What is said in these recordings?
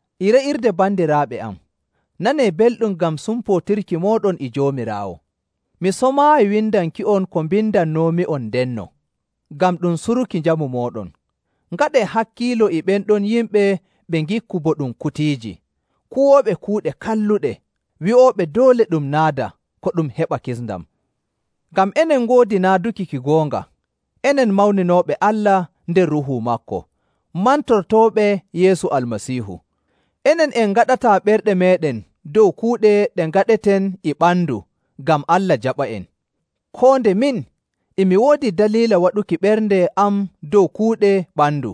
E re'irde bandiraaɓe am, nanee belɗum ngam sumpootirki mooɗon e Joomiraawo. Mi somaayi windanki'on ko mbindannoomi'on ndenno, ngam ɗum suruki njamu mooɗon. Ngaɗee hakkiilo e ɓen ɗon yimɓe ɓe ngikku bo ɗum kutiiji, kuwooɓe kuuɗe kalluɗe, wi'ooɓe doole ɗum naada ko ɗum heɓa kisndam. Ngam enen ngoodi naaduki ki goonga, enen mawninooɓe Allah nder Ruuhu maako, mantortooɓe Yeesu Almasiihu. Enen en ngaɗataa ɓerɗe meeɗen dow kuuɗe ɗe ngaɗeten e ɓandu ngam Allah jaɓa'en, koo nde min, e mi woodi daliila waɗuki ɓernde am dow kuuɗe ɓandu.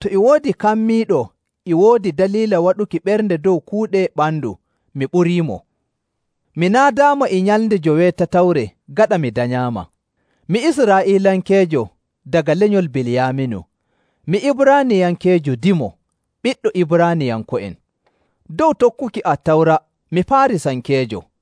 To e woodi kammiiɗo e woodi daliila waɗuki ɓernde dow kuuɗe ɓandu, mi ɓuriimo. Mi naadaama e nyalnde joweetatawre gaɗa mi danyaama. Mi Israa'iilankeejo, daga lenyol Biliyaaminu, mi Ibraaniyankeejo dimo, ɓiɗɗo Ibraaniyanko'en. Dow tokkuki Attawra, mi Faarisankeejo..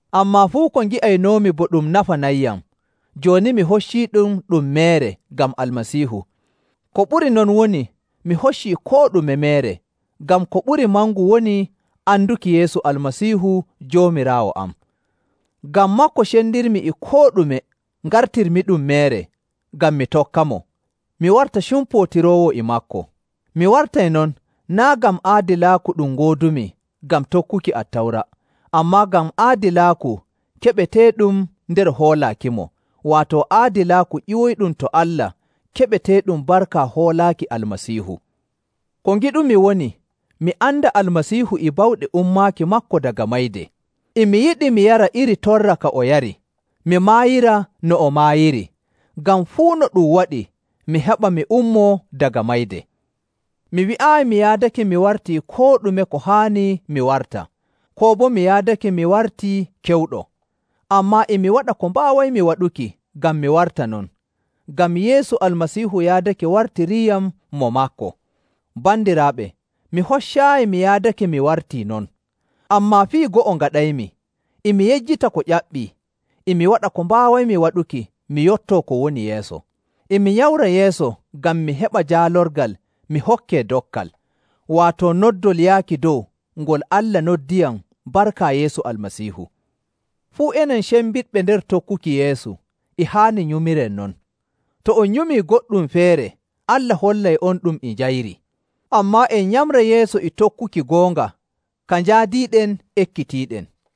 Ammaa fuu ko ngi'aynoomi bo ɗum nafanayyam, jooni mi hocciiɗum ɗum meere ngam Almasiihu. Ko ɓuri non woni mi hoccii koo ɗume meere, ngam ko ɓuri mangu woni anduki Yeesu Almasiihu Joomiraawo am. Ngam maako cendirmi e koo ɗume ngartirmi ɗum meere, ngam mi tokkamo, mi warta cumpootiroowo e maako. Mi wartay non naa' ngam aadilaaku ɗum ngoodumi ngam tokkuki Attawra, ammaa ngam aadilaaku keɓeteeɗum nder hoolaakimo, waato aadilaaku ƴiwoyɗum to Allah keɓeteeɗum barka hoolaaki Almasiihu. Ko ngiɗumi woni, mi anda Almasiihu e bawɗe ummaaki maako daga mayde. E mi yiɗi mi yara iri torra ka o yari, mi maayira no o maayiri, ngam fuu no ɗum waɗi mi heɓa mi ummoo daga mayde. Mi wi'aayi mi yaadake mi wartii koo ɗume ko haani mi warta, koo boo mi yaadake mi wartii kewɗo. Ammaa e mi waɗa ko mbaawaymi waɗuki ngam mi warta non, ngam Yeesu Almasiihu yaadake wartiriiyam mo maako. Bandiraaɓe, mi hoccaayi mi yaadake mi wartii non. Ammaa fii go'o ngaɗaymi: E mi yejjita ko ƴaɓɓii, e mi waɗa ko mbaawaymi waɗuki mi yottoo ko woni yeeso. E mi nyamra yeeso ngam mi heɓa jaalorgal mi hokkee dokkal, waato noddol yaaki dow ngol Allah noddiyam barka Yeesu Almasiihu. Fuu enen cembiɗɓe nder tokkuki Yeesu, e haani nyumiren non. To on nyumii goɗɗum feere, Allah hollay'onɗum e njayri. Ammaa en nyamra yeeso e tokkuki goonga ka njaadiiɗen ekkitiiɗen.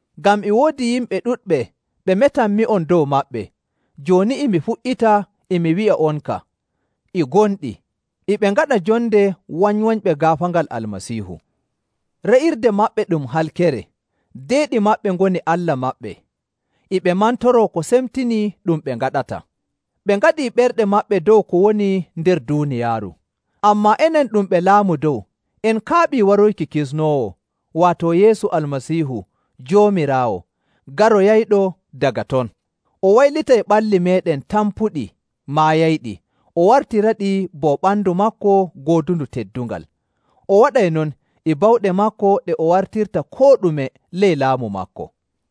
Ngam e woodi yimɓe ɗuɗɓe ɓe metanmi'on dow maɓɓe, jooni e mi fuɗɗita e mi wi'a'onka e gonɗi, e ɓe ngaɗa jonde wanywanyɓe gaafaangal Almasiihu. Re'irde maɓɓe ɗum halkere, deeɗi maɓɓe ngoni allah maɓɓe, e ɓe mantoroo ko semtinii ɗum ɓe ngaɗata. Ɓe ngaɗii ɓerɗe maɓɓe dow ko woni nder duuniyaaru. Ammaa enen ɗum ɓe laamu dow, en kaaɓii wartoyki Kisnoowo, waato Yeesu Almasiihu Joomiraawo garoyayɗo daga ton. O waylitay ɓalli meeɗen tampuɗi maayayɗi, o wartiraɗi bo ɓandu maako goodundu teddungal. O waɗay non e bawɗe maako ɗe o wartirta koo ɗume ley laamu maako.